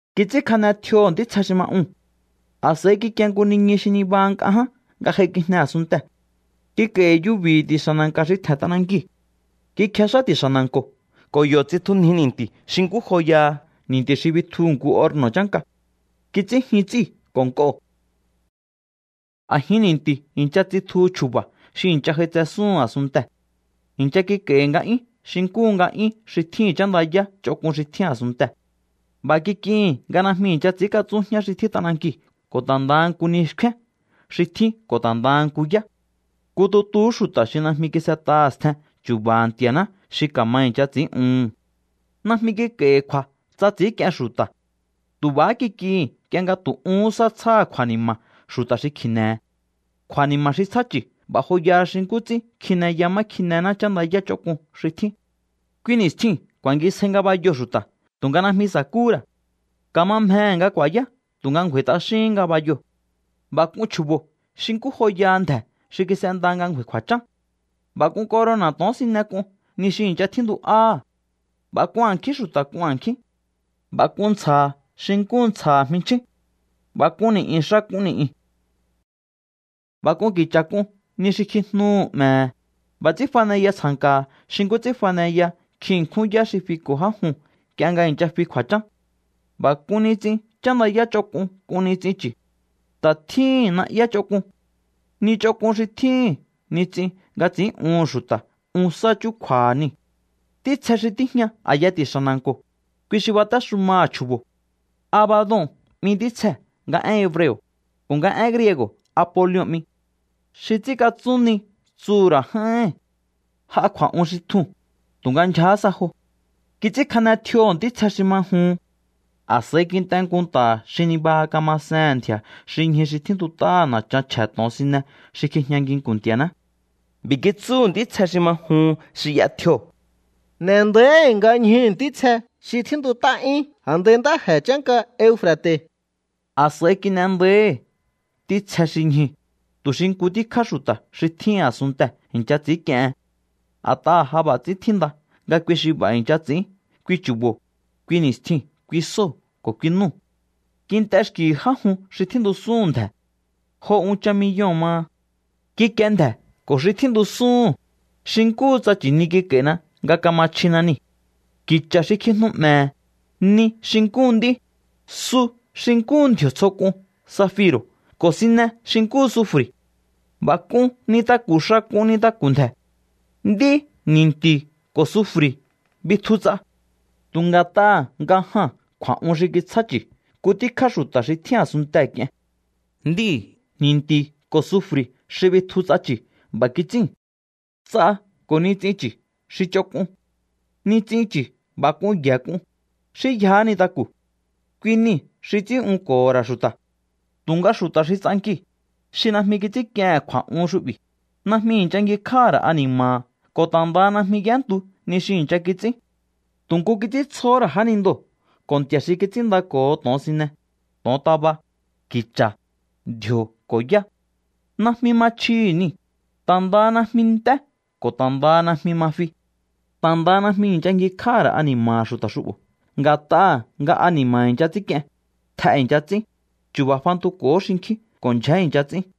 Kits'ínkjane tjioho̱ ntítsje xi ma uu̱n. A̱s'a̱i kikie nku niñu xi nibaha nk'a ján nga j'aikijne a̱sunntee̱. Kik'a̱i̱hi̱ yubi̱hi̱ ti̱xa̱ na̱nka̱ xi tje̱n t'anankiu̱. Kikjex'á ti̱xa̱ na̱nko̱ ko̱ yo̱ tsitjunji ni̱nti̱ xi nkú joyaha ni̱nti̱ xi bitjuhu̱ nku orno̱ chánka. Kits'ín jyun ts'íu̱ ko̱ nk'oo̱. A̱jin ni̱nti̱u̱ i̱ncha tsitjuhu chju̱ba̱ xi i̱ncha j'aitsesúhun a̱sunntee̱. I̱ncha kik'a̱i̱hi̱ nga'yún xi nkúhu nga'yún xi tjíhi̱n chándayá ch'onk'un xi tjín a̱sunntee̱. B'a̱ kik'ihi̱n nga najmi i̱ncha ts'i̱ínkatsún jñá xi tjín t'anankiu̱ ko̱ ta̱ ndaha nku ni xkfén xi tjín ko̱ ta̱ ndaha nku yá. Nku tutuhú xu̱ta̱ xi najmi kis'et'aha̱ stjen chu̱ba̱ha̱ Nti̱a̱ná xi ka̱ma i̱ncha ts'i̱ín'uhu̱n. Najmi kik'a̱i̱hi̱ kju̱a̱ tsa ts'i̱ínk'ien xu̱ta̱. Tu̱ b'a̱há kik'ihi̱n nk'ie nga tu̱ uhún sá tsjáha̱ kju̱a̱ni̱ma̱ xu̱ta̱ xi kji̱ne̱he̱. Kju̱a̱ni̱ma̱ xi tsjá chu̱ b'a̱ joyaha xi nkú ts'ín kjineya má kjinená chándayá ch'onk'un xi tjín. Kui ni̱stjiu̱n ku̱a̱ngisjai ngabayoo̱ xu̱ta̱ tu̱nga najmi sa̱kúhú ra̱. Ka̱ma mjehe̱ nga ku̱a̱yá tu̱nga ngju̱a̱i̱ t'axíhín ngabayoo̱. B'a̱ k'un chju̱bo̱ xi nkú joyaha ndje̱ xi kis'enda nga ngju̱a̱i̱ kju̱a̱chán. B'a̱ k'un corona̱ to̱onsine k'un ni xi i̱ncha tjíntu'áha̱. B'a̱ k'un a̱nkjín xu̱ta̱ k'un a̱nkjín. B'a̱ k'un ntsja̱ha̱ xi nkúhu ntsja̱ha̱ jminchjín. B'a̱ k'un ni̱'yu̱n xa k'un ni̱'yu̱n. B'a̱ k'un ki̱cha̱ k'un ni xi kjijnuhu̱ 'me̱he̱. B'a̱ ts'ín faneya tsja̱nka̱ha̱ xi nkú ts'ín faneya nkjin ṉkjún yá xi fiko̱ já juu̱n nk'ie nga i̱ncha fi kju̱a̱chán. B'a̱ k'un nits'in chándayá ch'onk'un k'un nits'in chu̱. Ta̱ tjíhi̱n na'yá ch'onk'un. Ni ch'onk'un xi tjíhi̱n nits'in nga ts'i̱ín'uhu̱n xu̱ta̱ un sá chúkju̱a̱ha̱ niu̱. Ntítsje xi tíjña a̱yaha̱ ti̱xa̱ na̱nko̱, kui xi batéxumaha̱ chju̱bo̱. Abadon 'mi ntítsjee̱ nga én hebreo̱, ko̱ nga én griego̱ Apolion 'mi. “Xi ts'ínkatsún ni” tsuhu̱ ra̱ j'áíhi̱n. J'a kju̱a̱'un xi tjuu̱n, tu̱nga ndyjahá sa jo. Kits'ínkjane tjioho̱ ntítsje xi ma juhun. A̱s'a̱i kint'e nku nta̱ xi nibaha kamasehe̱n ndji̱a̱ xi ñju xi tjíntut'á na̱chan chje̱ to̱onsine xi kjijña nginku̱n Nti̱a̱ná. B'i̱ kitsúhu̱ ntítsje xi ma juhun xi y'a tjio̱: —N'e̱ nda̱íhi̱ nga ñjuu̱ ntítsje xi tjíntut'á 'yún a̱ndai ntáje̱ chánka Eufra̱te̱. A̱s'a̱i kin'e nda̱íhi̱ ntítsje xi ñjuu̱, tu̱ xi nku tíkjá xu̱ta̱ xi tjín a̱sunntee̱ i̱ncha ts'i̱ínk'iehen. A̱t'aha̱ ja b'a̱ ts'ín tjínda nga kui xi b'a̱ i̱ncha ts'i̱ín kui chu̱bo̱, kui ni̱stjiu̱n, kui sóo̱ ko̱ kui núu̱. Kint'e xki̱hi̱ já jun xi tjíntusúhu̱n ndje̱. Jo unchan miyoo̱n maha. Kikie ndje̱ ko̱ xi tjíntusúhu̱n, xi nkúhu tsa nchi̱ni kik'a̱i̱na nga kama chjina niu̱. Ki̱cha̱ xi kjijnu 'mje̱he̱, ni xi nkúhu nd'í, su xi nkúhu ndji̱o̱ tsjo k'un safiro̱ ko̱ sine xi nkúhu sufri̱. B'a̱ k'un nintaku̱ xa k'un nintaku̱ ndje̱. Nd'í, ni̱nti̱ ko̱ sufri̱ bitju ts'a. Tu̱ nga̱t'aha̱ nga jaa̱n kju̱a̱'un xi kitsjá chu̱ nku tíkjá xu̱ta̱ xi tjín a̱sunntee̱ k'ien. Nd'íu̱, ni̱nti̱ ko̱ sufri̱ xi bitju ts'a chu̱ b'a̱ kits'íu̱n. Ts'a ko̱ nits'in chu̱ xi ch'onk'un. Nits'in chu̱ b'a̱ k'un y'e̱ k'un, xí yjahá nintaku̱. Kui niu̱ xi ts'ín'unko̱ho̱ ra̱ xu̱ta̱. Tu̱nga xu̱ta̱ xi ts'ankiu̱, xi najmi kits'ínk'iehe̱n kju̱a̱'un xu'bi̱, najmi i̱ncha ngjikj'áha̱ ra̱ ani̱ma̱ha̱ ko̱ ta̱ ndaha najmi y'éntu ni xi i̱ncha kits'ín. Tu̱ nku kits'íntsjohó ra̱ jánindoo̱ ko̱ nti̱a̱ xi kits'ínndako̱ho to̱onsine, to̱ontaba, ki̱cha̱, ndji̱o̱ ko̱ yá. Najmi ma chjihi̱ niu̱, ta̱ ndaha najmi nt'é ko̱ ta̱ ndaha najmi ma fi. Ta̱ ndaha najmi i̱ncha ngjikj'áha̱ ra̱ ani̱ma̱ha̱ xu̱ta̱ xu'bo̱ nga̱t'aha̱ nga ani̱ma̱ i̱ncha ts'ínk'ien, tj'e i̱ncha ts'ín, chu̱ba̱ fantuko̱hó xinkjín ko̱ ndyjé i̱ncha ts'ín.